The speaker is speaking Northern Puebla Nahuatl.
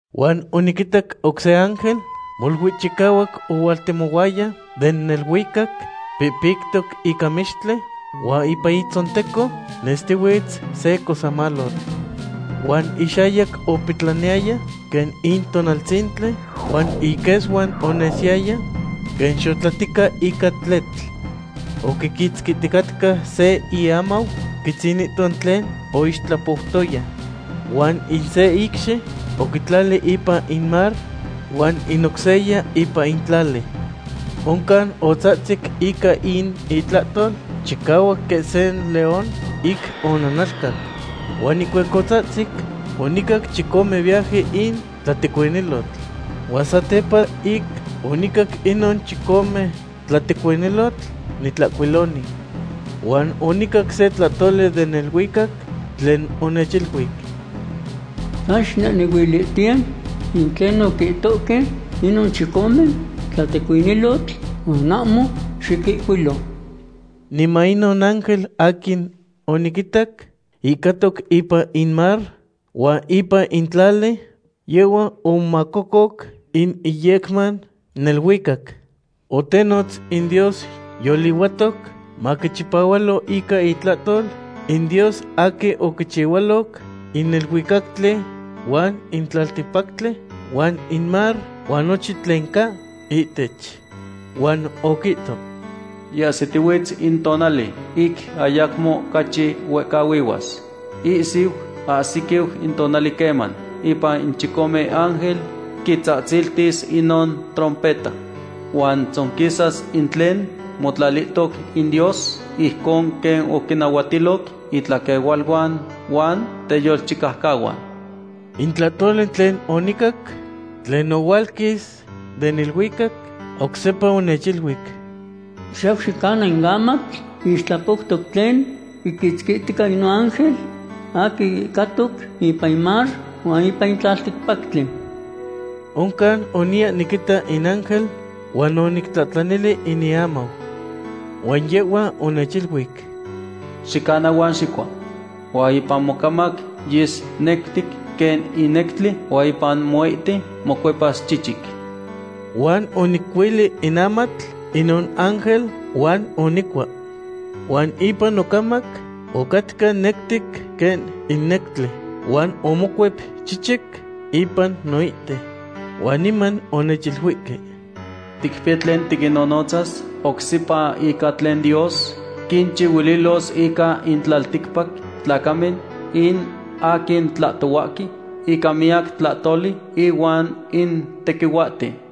Huan oniquitac oc se ángel molui chicahuac ohualtemohuaya den neluicac pihpictoc ica mextli huan ipan itzonteco nestihuitz se cosemalotl. Huan ixayac opetlaniyaya quen in tonaltzintli, huan iquesuan onesiyaya quen xotlatica ica tletl. Oquiquitzquihticatca se iamau quitzinihto tlen oixtlapoutoya. Huan in se icxi oquitlali ipan in mar huan in oc seya ipan in tlali. Oncan otzahtzic ica in itlahtol chicahuac quen se león ic onanalcac. Huan ihcuac otzahtzic, onicac chicome viaje in tlatecuinilotl. Huan satepa ic onicac inon chicome tlatecuinilotl, nitlahcuiloni. Huan onicac se tlahtoli den neluicac tlen onechiluic: ―San xicnehnehuilihtiye in tlen oquihtohque inon chicome tlatecuinilotl huan ahmo xiquihcuilo. Niman inon ángel aquin oniquitac ihcatoc ipan in mar huan ipan in tlali, yehhua omomaahcoc in iyecman neluicac. Otenotz in Dios yolihuatoc maquichipahualo ica itlahtol, in Dios aquin oquichihualoc in neluicactli huan in tlalticpactli huan in mar huan nochin tlen ca ihtech. Huan oquihto: ―Yiahsitihuiz in tonali ic ayacmo ocachi huehcahuihuas. Ihsiu ahsiquiu in tonali queman ipan in chicome ángel quitzahtziltis inon trompeta. Huan tzonquisas in tlen motlalihtoc in Dios, ijcon quen oquinnahuatiloc itlaquehualuan huan teyolchicaucahuan. In tlahtoli tlen onicac, tlen ohualquis den neluicac, oc sepa onechiluic: ―Xiyau xicana in amatl ixtlapoutoc tlen quiquitzquihtica inon ángel aquin ihcatoc ipan in mar huan ipan in tlalticpactli. Oncan oniya niquita in ángel huan onictlahtlanili in iamau. Huan yehhua onechiluic: ―Xicana huan xicua. Huan ipan mocamac yes nectic quen in nectli huan ipan moite mocuepas chichic. Huan onicuili in amatl inon ángel huan onicua. Huan ipan nocamac ocatca nectic quen in nectli, huan omocuep chichic ipan noite. Huan niman onechiluihque: ―Ticpiya tlen tiquinnonotzas oc sepa ica tlen Dios quinchihuililos ica in tlalticpac tlacamen, in aquin tlahtohuahque ica miyac tlahtoli ihuan in tequihuahten.